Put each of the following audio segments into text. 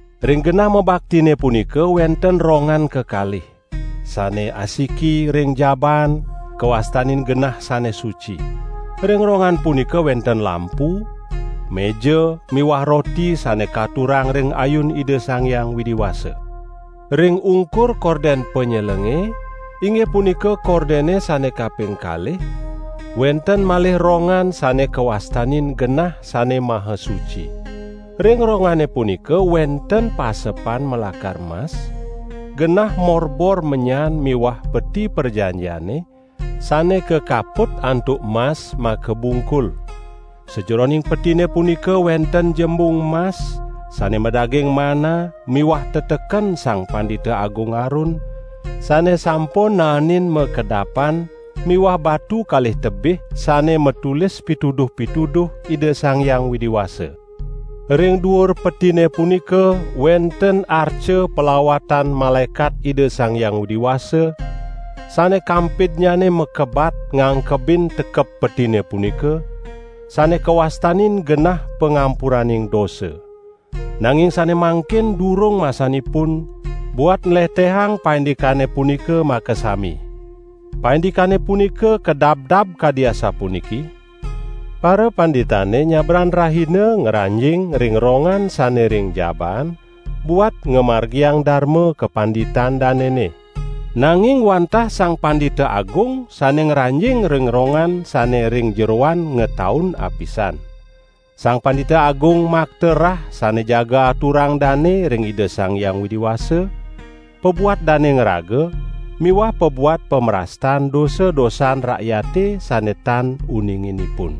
Ring genah mabaktine punika wenten rongan kekalih, sane asiki ring jabaan, kawastanin Genah Sane Suci. Ring rongan punika wenten lampu, meja miwah roti sane katurang ring ayun Ida Sang Hyang Widi Wasa. Ring ungkur korden panyelenge, inggih punika kordene sane kaping kalih, wenten malih rongan sane kawastanin Genah Sane Maha Suci. Ring rongane punika wenten pasepan malakar mas, genah morbor menyan miwah Peti Prajanjiane, sane kakaput antuk mas makabungkul. Sajeroning petine punika wenten jembung mas, sane madaging manna miwah teteken Sang Pandita Agung Harun sane sampun naenin makedapan miwah batu kalih tebih sane matulis pituduh-pituduh Ida Sang Hyang Widi Wasa. Ring duur Petine punika wenten arca palawatan malaekat Ida Sang Hyang Widi Wasa, sane kampidnyane makebat ngangkebin tekep Petine punika, sane kawastanin genah pangampuraning dosa. Nanging sane mangkin durung masanipun buat nlehtehang paindikane punika makasami. Paindikane punika kadabdab kadi asapuniki: parapanditane nyabran rahina ngranjing ring rongan sane ring jabaan buat ngamargiang darma kapanditan danene. Nanging wantah Sang Pandita Agung sane ngranjing ring rongan sane ring jeroan ngataun apisan. Sang Pandita Agung makta rah sane jaga aturang dane ring Ida Sang Hyang Widi Wasa pabuat dane ngraga miwah pabuat pamrastan dosa-dosan rakyate sane tan uninginipun.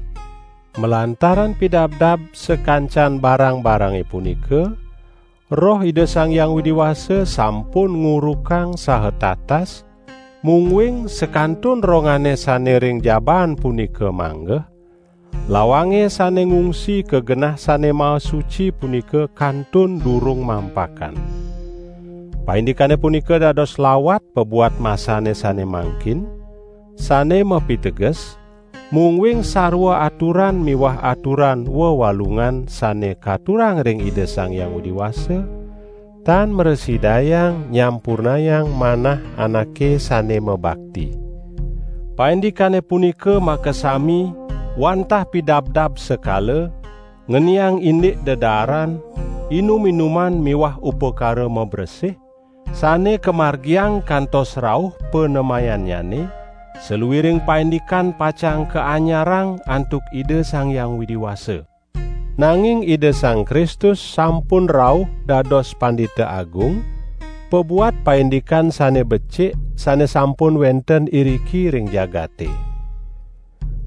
Malantaran pidabdab sakancan barang-barange punika, Roh Ida Sang Hyang Widi Wasa sampun ngurukang saha tatas mungguing sakantun rongane sane ring jabaan punika manggeh, lawange sane ngungsi ka Genah Sane Maha Suci punika kantun durung mampakan. Paindikane punika dados lawat pabuat masane sane mangkin, sane mapiteges: mungguing sarwa aturan miwah aturan wewalungan sane katurang ring Ida Sang Hyang Widi Wasa tan mrasidayang nyampurnayang manah anake sane mabakti. Paindikane punika makasami wantah pidabdab sekala, ngeniang indik dedaaran, inum-inuman miwah upakara mabresih, sane kamargiang kantos rauh panemayannyane saluiring paindikan pacang kaanyarang antuk Ida Sang Hyang Widi Wasa. Nanging Ida Sang Kristus sampun rauh dados Pandita Agung pabuat paindikan sane becik sane sampun wenten iriki ring jagate.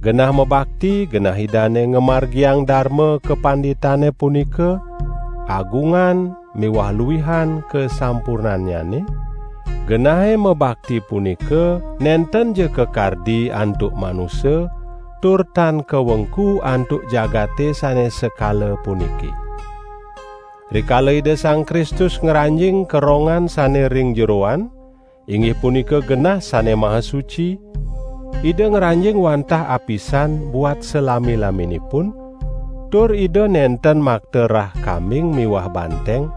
Genah mabakti genah Idane ngamargiang darma kapanditane punika agungan miwah luihan kasampurnannyane; genahe mabakti punika nentenja kakardi antuk manusa, tur tan kawengku antuk jagate sane sekala puniki. Rikala Ida Sang Kristus ngranjing ka rongan sane ring jeroan, inggih punika Genah Sane Maha Suci, Ida ngranjing wantah apisan buat salami-laminipun tur Ida nenten makta rah kambing miwah banteng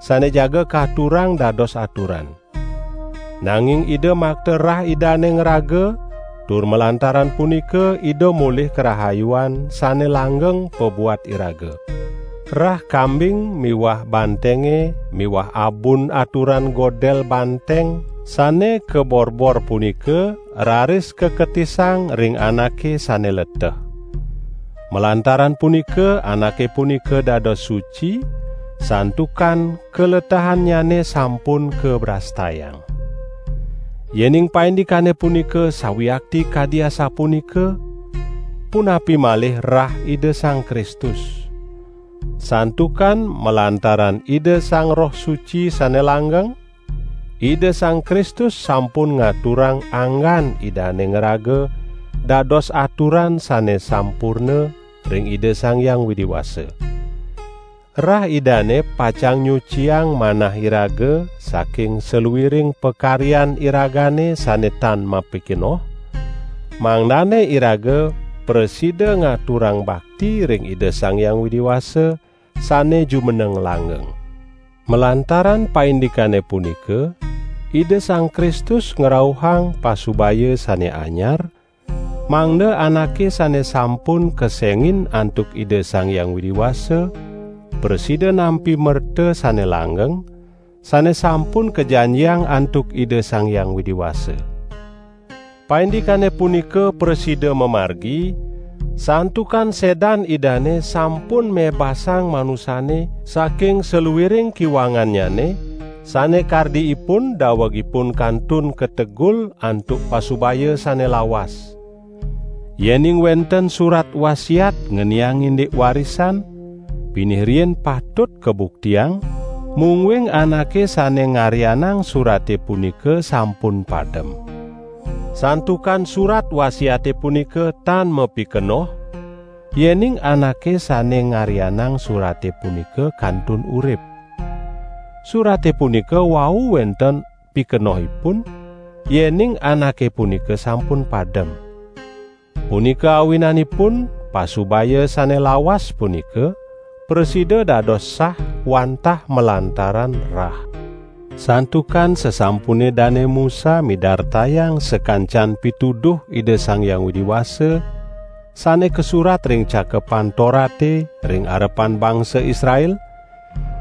sane jaga katurang dados aturan. Nanging Ida makta rah Idane ngraga tur malantaran punika Ida molih karahayuan sane langgeng pabuat iraga. Rah kambing miwah bantenge miwah abun aturan godel banteng sane kaborbor punika raris kaketisang ring anake sane leteh. Malantaran punika anake punika dados suci, santukan kaletehannyane sampun kabrastayang. Yening paindikane punika sawiakti kadi asapunika, punapi malih rah Ida Sang Kristus. Santukan malantaran Ida Sang Roh Suci sane langgeng, Ida Sang Kristus sampun ngaturang anggan Idane ngraga dados aturan sane sampurna ring Ida Sang Hyang Widi Wasa. Rah Idane pacang nyuciang manah iraga saking saluiring pakaryan iragane sane tan mapikenoh, mangdane iraga prasida ngaturang bakti ring Ida Sang Hyang Widi Wasa sane jumeneng langgeng. Malantaran paindikane punika Ida Sang Kristus ngrauhang pasubaya sane anyar, mangda anake sane sampun kesengin antuk Ida Sang Hyang Widi Wasa prasida nampi merta sane langgeng, sane sampun kajanjiang antuk Ida Sang Hyang Widi Wasa. Paindikane punika prasida mamargi, santukan sedan Idane sampun mebasang manusane saking saluiring kiwangannyane, sane kardi ipun daweg ipun kantun kategul antuk pasubaya sane lawas. Yening wenten surat wasiat ngeniang indik warisan, pinih riin patut kabuktiang, mungguing anake sane ngaryanang surate punika sampun padem. Santukan surat wasiate punika tan mapikenoh, yening anake sane ngaryanang surate punika kantun urip. Surate punika wau wenten pikenohipun, yening anake punika sampun padem. Punika awinanipun pasubaya sane lawas punika prasida dados sah wantah malantaran rah. Santukan sasampune Dane Musa midartayang sakancan pituduh Ida Sang Hyang Widi Wasa sane kasurat ring Cakepan Torate ring arepan bangsa Israel,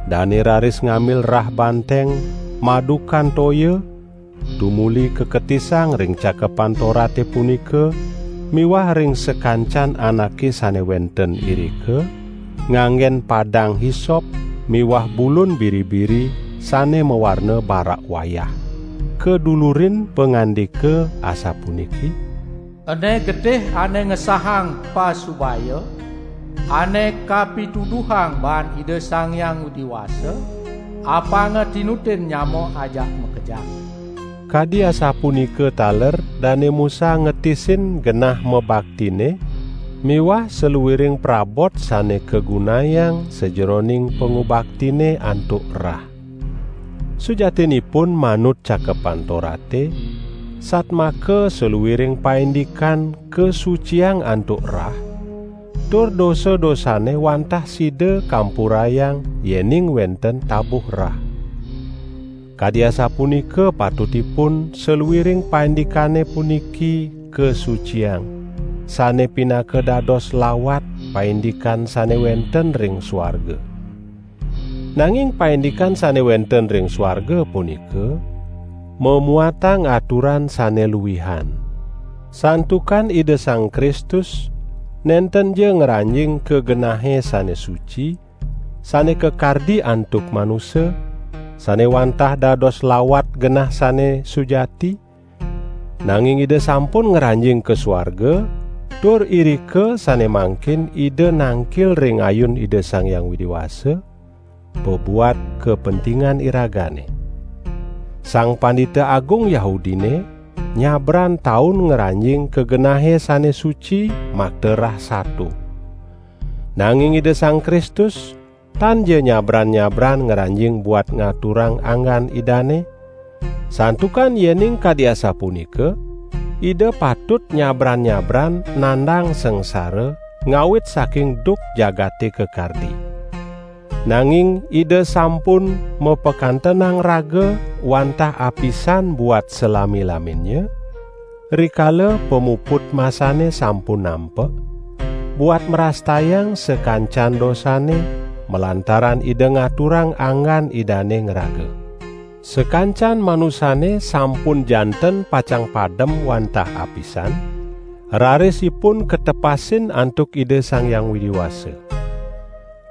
dane raris ngambil rah banteng madukan toya, tumuli kaketisang ring Cakepan Torate punika miwah ring sakancan anake sane wenten irika, nganggen padang hisop miwah bulun biri-biri sane mawarna barak wayah, kadulurin pangandika asapuniki: "Ene getih ane ngesahang pasubaya, ane kapituduhang baan Ida Sang Hyang Widi Wasa, apanga tinutin nyama ajak makejang." Kadi asapunika taler Dane Musa ngetisin genah mabaktine miwah saluiring prabot sane kagunayang sajeroning pangubaktine antuk rah. Sujatinipun, manut Cakepan Torate, satmaka saluiring paindikan kasuciang antuk rah; tur dosa-dosane wantah sida kampurayang, yening wenten tabuh rah. Kadi asapunika patutipun saluiring paindikane puniki kasuciang, sane pinaka dados lawat paindikan sane wenten ring suarga. Nanging paindikan sane wenten ring suarga punika mamuatang aturan sane luihan. Santukan Ida Sang Kristus nentenja ngranjing ka Genahe Sane Suci, sane kakardi antuk manusa, sane wantah dados lawat Genah Sane Sujati, nanging Ida sampun ngranjing ka suarga, tur irika sane mangkin Ida nangkil ring ayun Ida Sang Hyang Widi Wasa pabuat kapentingan iragane. Sang Pandita Agung Yahudine nyabran taun ngranjing ka Genahe Sane Suci makta rah sato. Nanging Ida Sang Kristus tanja nyabran-nyabran ngranjing buat ngaturang anggan Idane, santukan yening kadi asapunika Ida patut nyabran-nyabran nandang sangsara ngawit saking duk jagate kakardi. Nanging, Ida sampun mapakantenang raga wantah apisan buat salami-laminnya, rikala pamuput masane sampun nampek, buat mrastayang sakancan dosane, malantaran Ida ngaturang anggan Idane ngraga. Sakancan manusane sampun janten pacang padem wantah apisan, raris ipun katepasin antuk Ida Sang Hyang Widi Wasa.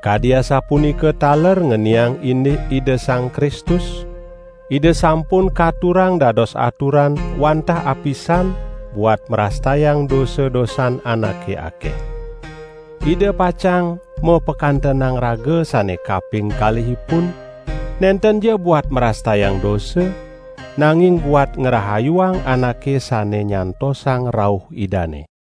Kadi asapunika taler ngeniang indik Ida Sang Kristus, Ida sampun katurang dados aturan wantah apisan buat mrastayang dosa-dosan anake akeh. Ida pacang mapakantenang raga sane kaping kalihipun nentenja buat mrastayang dosa, nanging buat ngrahayuang anake sane nyantosang rauh Idane.